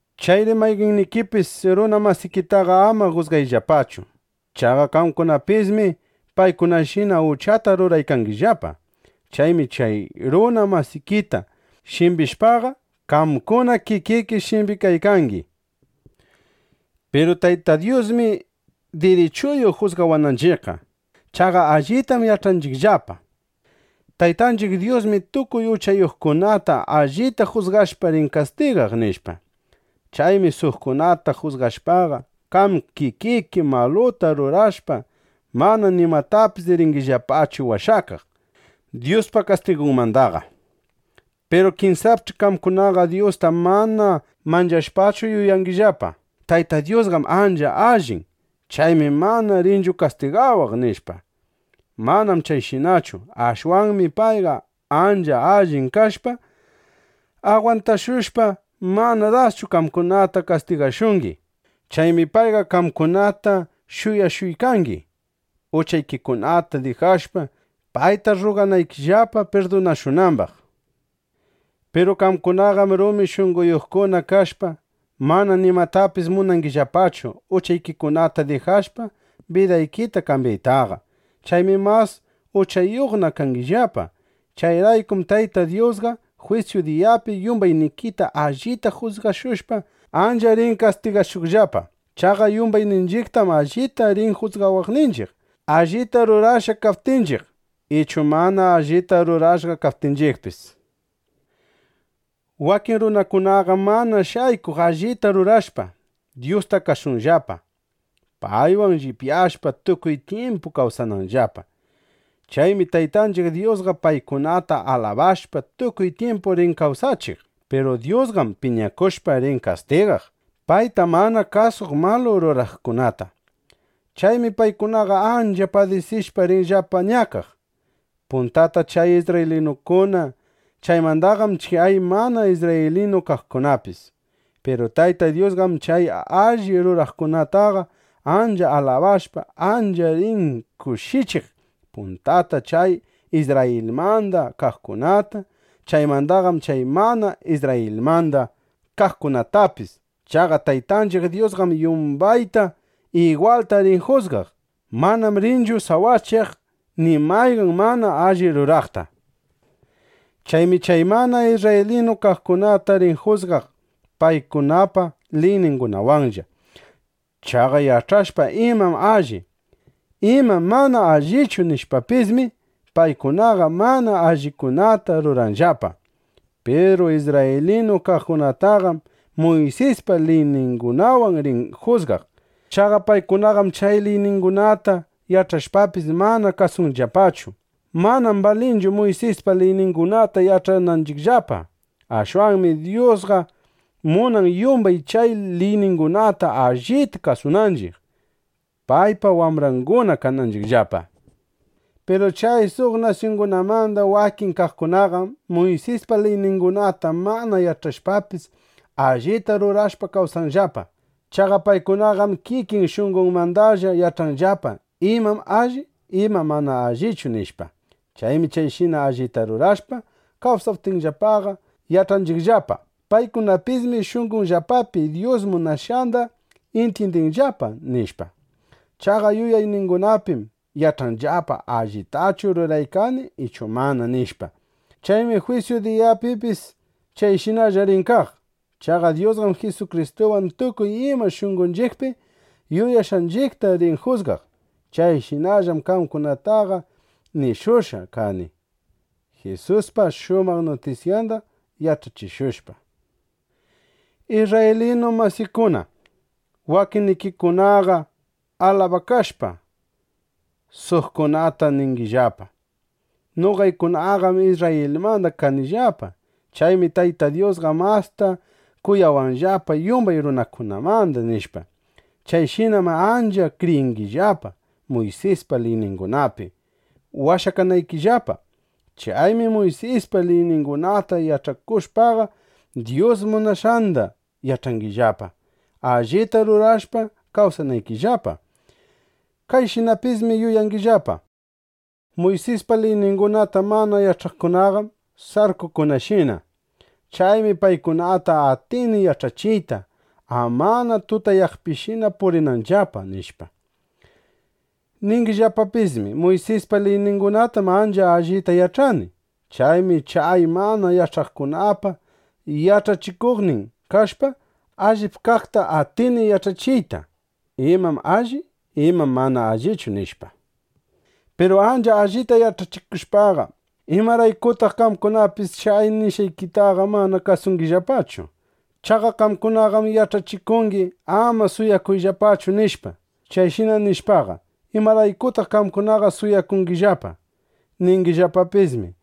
Chayri mayqannikipis, runa masikitaqa ama jusgayllapachu. Chaqa qamkunapismi paykunashina uchata ruraykangillapa. Chaymi chay runa masikita shimbishpaqa, qamkuna kikiki shimbikaykangi. (Piru Tayta Dyusmi dirichuyuq jusgawananchiqqa.) Chaqa allitam yach'anchiqllapa: Taytanchiq Dyusmi tukuy uchayuqkunata allita jusgashpa, rin kastigaq, nishpa. Chaymi suqkunata jusgashpaqa, qam kikiki maluta rurashpa, mana nimatapis ringillapachu washakaq Dyuspa kastigunmandaqa. Piru kinsapch'i qamkunaqa Dyusta mana manchashpachu yuyangillapa: Tayta Dyusqam ancha allin. Chaymi mana rinchu kastigawaq, nishpa. Manam chayshinachu. Ashwanmi payqa ancha allin kashpa, agwantashushpa, mana daschu qamkunataqa kastigashungi. Chaymi payqa qamkunata shuyashuykangi, uchaykikunata dijashpa, payta rruganaykillapa pirdunashunambaq. Piru qamkunaqam rumi shunqoyuqkuna kashpa, mana nimatapis munangillapachu uchaykikunata dijashpa, bidaykita kambyaytaqa. Chaymi mas uchayuqna kangillapa. Chayraykum Tayta Dyusqa jwisyu diyapi yumbaynikita allita jusgashushpa, ancha rin kastigashuqllapa. Chaqa yumbayninchiqtam allita rin jusgawaqninchiq, allita rurashqa kaptinchiq, ichu mana allita rurashqa kaptinchiqpis. Wakin runakunaqam mana shaykuq allita rurashpa, Dyusta kasunllapa, paywan llipyashpa, tukuy tyimpu kawsananllapa. Chaymi Taytanchiq Dyusqa paykunata alabashpa, tukuy tyimpu rin kawsachiq. Piru Dyusqam piñakushpa, rin kastigaq payta mana kasuq malu ruraqkunata. Chaymi paykunaqa ancha padisishpa, rinllapa ñakaq; puntata chay isrraylinukuna; chaymandaqam chay mana isrraylinu kaqkunapis. Piru Tayta Dyusqam chay alli ruraqkunataqa ancha alabashpa, ancha rin kushichiq, puntata chay Isrrayilmanda kaqkunata; chaymandaqam chay mana isrrayilmanda kaqkunatapis. Chaqa Taytanchiq Dyusqam yumbayta igwalta rin jusgaq. Manam rinchu sawachaq ni mayqan mana alli ruraqta. Chaymi chay mana isrraylinu kaqkunata rin jusgaq paykunapa liyningunawanlla. Chaqa yach'ashpa imam alli, imam mana allichu nishpapismi, paykunaqa mana allikunata ruranllapa. Piru isrraylinu kaqkunataqam Muysispa liyningunawan rin jusgaq. Chaqa paykunaqam chay liyningunata yach'ashpapis, mana kasunllapachu. Manam balinchu Muysispa liyningunata yach'ananchiqllaqa. Ashwanmi Dyusqa munan, yumbay chay liyningunata allita kasunanchiq, paypa wambranguna kananchiqllapa. Piru chay suq nasyungunamanda wakin kaqkunaqam Muysispa liyningunata mana yach'ashpapis, allita rurashpa kawsanllapa. Chaqa paykunaqam kikin shunqonmandalla yach'anllapa: Imam alli; imam mana allichu, nishpa. Chaymi chayshina allita rurashpa kawsaptinllapaqa, yach'anchiqllapa: Paykunapismi shunqonllapapi Dyus munashqanda intyindinllapa, nishpa. Chaqa yuyayningunapim yach'anllapa: Allitachu ruraykani ichu mana, nishpa. Chaymi jwisyu diyapipis chayshinalla rin kaq. Chaqa Dyusqam Jisukristuwan tukuy ima shunqonchiqpi yuyashqanchiqta rin jusgaq. Chayshinallam qamkunataqa nishushqa kani Jisuspa shumaq nutisyanda yach'achishushpa. Isrraylinu masiykuna, wakinnikikunaqa alabakashpa, suqkunata ningillapa: Noqaykunaqam Isrrayilmanda kanillapa. Chaymi Tayta Dyusqa masta kuyawanllapa yumbay runakunamanda, nishpa. Chayshinam ancha kriyingillapa Muysispa liyningunapi washakanaykillapa. Chaymi Muysispa liyningunata yach'akushpaqa, Dyus munashqanda yach'angillapa, allita rurashpa kawsanaykillapa. Kayshinapismi yuyangillapa: Muysispa liyningunata mana yach'aqkunaqam sarkukunashina. Chaymi paykunata atini yach'achiyta, amana tutayaqpishina purinanllapa, nishpa. Ningillapapismi: Muysispa liyningunatam ancha allita yach'ani. Chaymi chay mana yach'aqkunapa yach'achikuqnin kashpa, allip kaqta atini yach'achiyta: Imam alli; imam mana allichu, nishpa. Piru ancha allita yach'achikushpaqa, ¿imaraykutaq qamkunapis chay nishqaykitaqa mana kasungillapachu? Chaqa qamkunaqam yach'achikungi: “Ama suwakuyllapachu”, nishpa. Chayshina nishpaqa, ¿imaraykutaq qamkunaqa suwakungillapa? Ningillapapismi: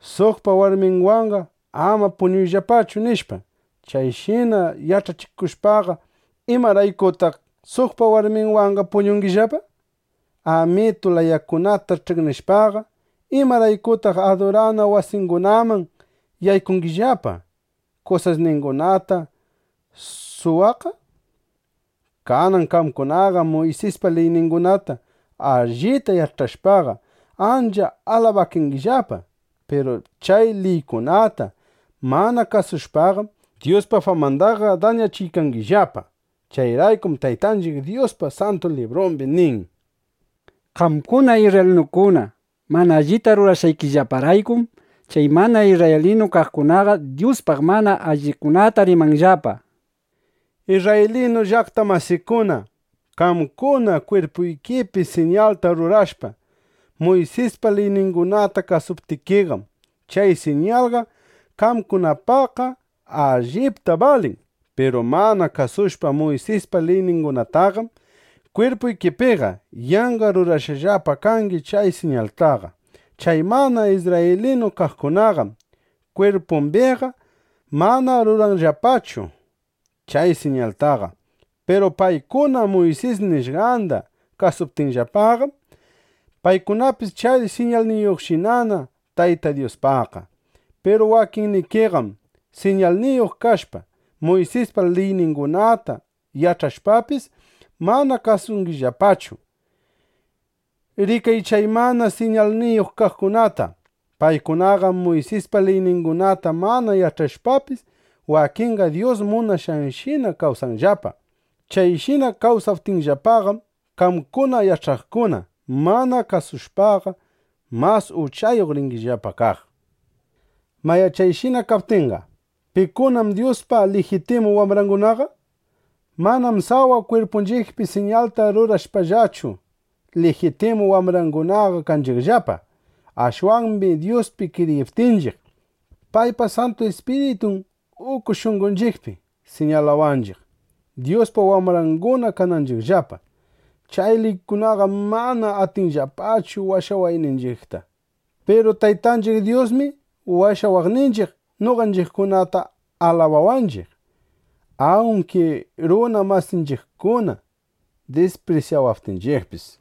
“Suqpa warminwanqa ama puñuyllapachu”, nishpa. Chayshina yach'achikushpaqa, ¿imaraykutaq suqpa warminwanqa puñungillapa? Amitu layakunata ch'iqnishpaqa, ¿imaraykutaq adurana wasingunaman yaykungillapa, kusasningunata suwaqqa? Kanan qamkunaqam Muysispa liyningunata allita yach'ashpaqa, ancha alabakangillapa. Piru chay liykunata mana kasushpaqam, Dyuspa famandaqa dañachiykangillapa. Chayraykum Taytanchiq Dyuspa Santu Librumbi nin: “Qamkuna isrraylinukuna mana allita rurashqaykillaparaykum, chay mana isrraylinu kaqkunaqa Dyuspaq mana allikunata rimanllapa,” nishpa. Isrraylinu llaqta masiykuna, qamkuna kwirpuykipi siñalta rurashpa, Muysispa liyningunata kasuptikiqam, chay siñalqa qamkunapaqqa allipta balin. Piru mana kasushpa Muysispa liyningunataqam, kwirpuykipiqa yanqa rurashqallapa kangi chay siñaltaqa. Chay mana isrraylinu kaqkunaqam kwirpumbiqa mana ruranllapachu chay siñaltaqa. Piru paykuna Muysis nishqanda kasuptinllapaqam, paykunapis chay siñalniyuqshinana Tayta Dyuspaqqa. Piru wakinnikiqam siñalniyuq kashpa, Muysispa liyningunata yach'ashpapis, mana kasungillapachu. Rikay chay mana siñalniyuq kaqkunata. Paykunaqam Muysispa liyningunata mana yach'ashpapis, wakinqa Dyus munashqanshina kawsanllapa. Chayshina kawsaptinllapaqam, qamkuna yach'aqkuna mana kasushpaqa, mas uchayuq ringillapa kaq. Mayá, chayshina kaptinqa, ¿pikunam Dyuspa lijitimu wambrangunaqa? Manam sawa kwirpunchiqpi siñalta rurashpallachu, lijitimu wambrangunaqa kanchiqllapa. Ashwanmi Dyuspi kriyiptinchiq, paypa Santu Ispiritun uku shunqonchiqpi siñalawanchiq, Dyuspa wambranguna kananchiqllapa. Chay liykunaqam mana atinllapachu washawayninchiqta. Piru Taytanchiq Dyusmi washawaqninchiq, noqanchiqkunata alabawanchiq, awnki runa masinchiqkuna disprisyawaptinchiqpis.